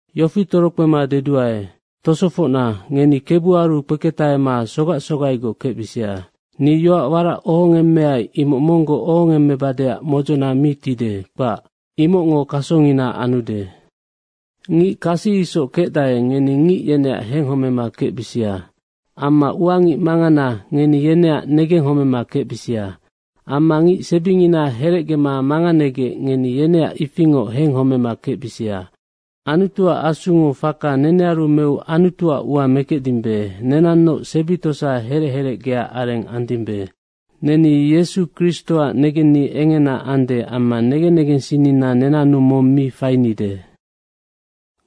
Yofi torokpema deduae. Tosofocna, ngeni Kebuaru kpeketahema sogac sogaigoc kecbisia. Ni yoac warac ohongemmeai imoc monggoc ohongemmebadeac modzona mi tide, kpac. Imocngo kasongina anude. Ngic kasi isoc kecdae, ngeni ngic yeneac henghomema kecbisia. Amma ua ngic mangana, ngeni yeneac negenghomema kecbisia amma ngic sebingina herecgema manganegec, ngeni yeneac ifingoc henghomema kecbisia. Anutuac Asungo faka nenearu meu Anutuac ua mekecdimbe, nenannoc sebi tosa herec herecgea areng andimbe. Neni Yesu Kristoac negenni engena ande amma negen negensinnina nenannu mong mi fainide.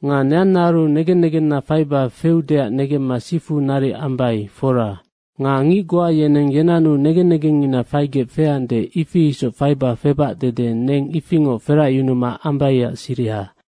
Nga neannaaru negen negenna faiba feudeac negemma sifu naric ambai, fora. Nga ngic goa yeneng yenannu negen negengngina faigec feande, ifi isoc faiba febac dede neng ifingoc feracyunuma ambaiac siriha.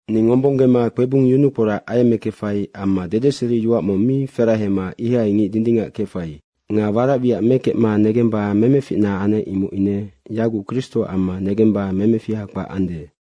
Ni ngombonggema kpebung yunukporac ayemmekefai amma dedeseriyoac mong mi ferahema ihai ngic dindingac kefai. Nga warac wiac mekecma negemba memeficna anec, imoc ine yaguc Kristoac amma negemba memefiha kpac ande.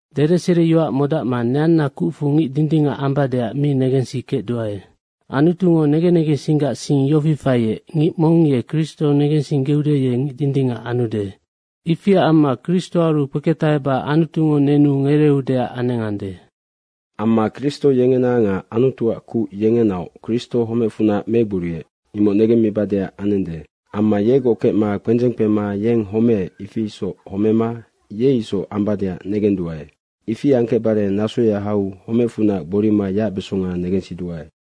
Dedeseriyoac modacma neanna kucfu ngic dindingac ambadeac mi negensikecduae. Anutungo negen negensinggac sing yofi faiec, ngic mong ye Kristo negensinggeude, ye ngic dindingac anude. Ifiac amma Kristoaru kpeketaheba Anutungo nenu ngereeudeac anengande. Amma Kristo yengena nga Anutuac kuc yengenaoc Kristo homecfunac megboriec, imoc negemmibadeac anende. Amma yegoc kecma kpendzeng kpema yeng homeec, ifi isoc homema ye isoc ambadeac negenduae. Ifi angkecbare nasoya hau homecfunac gborima yacbesonga negensiduae.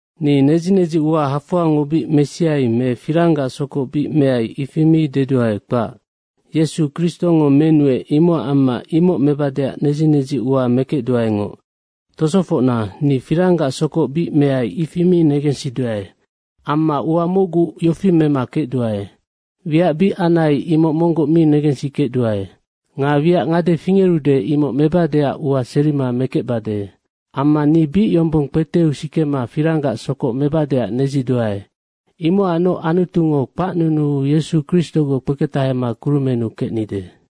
Ni nedzi nedzi ua hafoangoc bic mesiai me firanggac sokoc bic meai, ifi mi deduae, kpac. Yesu Kristongo menuec, imocac amma imoc mebadeac nedzi nedzi ua mekecduaengoc. Tosofocna, ni firanggac sokoc bic meai, ifi mi negensiduae. Amma ua mocgu yofi mema kecduae. Wiac bic anai, imoc monggoc mi negensikecduae nga wiac ngade fingerude, imoc mebadeac ua serima mekecbade. Amma ni bic yombong kpeteu sikema firanggac sokoc mebadeac nedziduae. Imocacnoc Anutungo kpacnunuu Yesu Kristogoc kpeketahema kurumennu kecnide.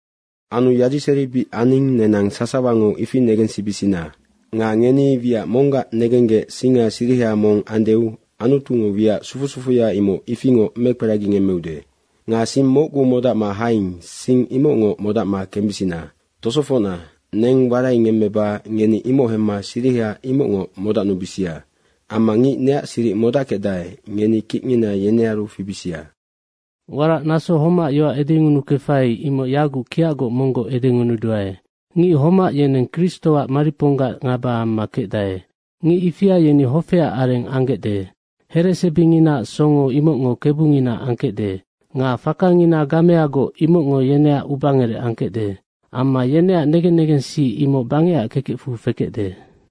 Anu yadiseri bic aning, nenang sasawango ifi negensibisina. Nga ngeni wiac monggac negenggec singa siriha mong anudeu Anutungo wiac sufu sufuya imoc ifingoc mekperagingemmeude. Nga sing mocgu modacma haing, sing imocngoc modacma kembisina. Tosofocna, neng waraingemmeba ngeni imoc hemma siriha imocngoc modacnubisia. Amma ngic neac siric modackecdae, ngeni kicngina yenearu fibisia. Warac naso homac yoac edengunukefai, imoc yaguc kiacgoc monggoc edengunuduae. Ngic homac yeneng Kristoac mariponggac ngaba amma kecdae. Ngic ifia yeni hofeac areng anggecde. Heresebinginaac songo, imocngo kebungina angkecde. Nga fakangina gameagoc, imocngo yeneac ubangerec angkecde amma yeneac negen negensi imoc bangecac kekecfu fekecde.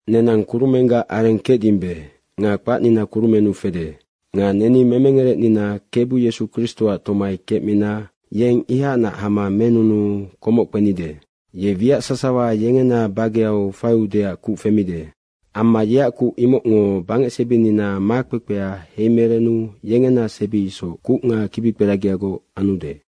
Nenang kurumenggac areng kecdimbe nga kpacnina kurumennu fede. Nga neni memengerecnina Kebu Yesu Kristoac tomai kecmina yeng ihacnac hama menunuu komoc kpenide. Ye wiac sasawa yengena bageu faiudeac kuc femide. Amma yeac kuc imocngo bangecsebinina makpekpea heimerenu yengena sebi isoc kuc nga kibikperagiagoc anude.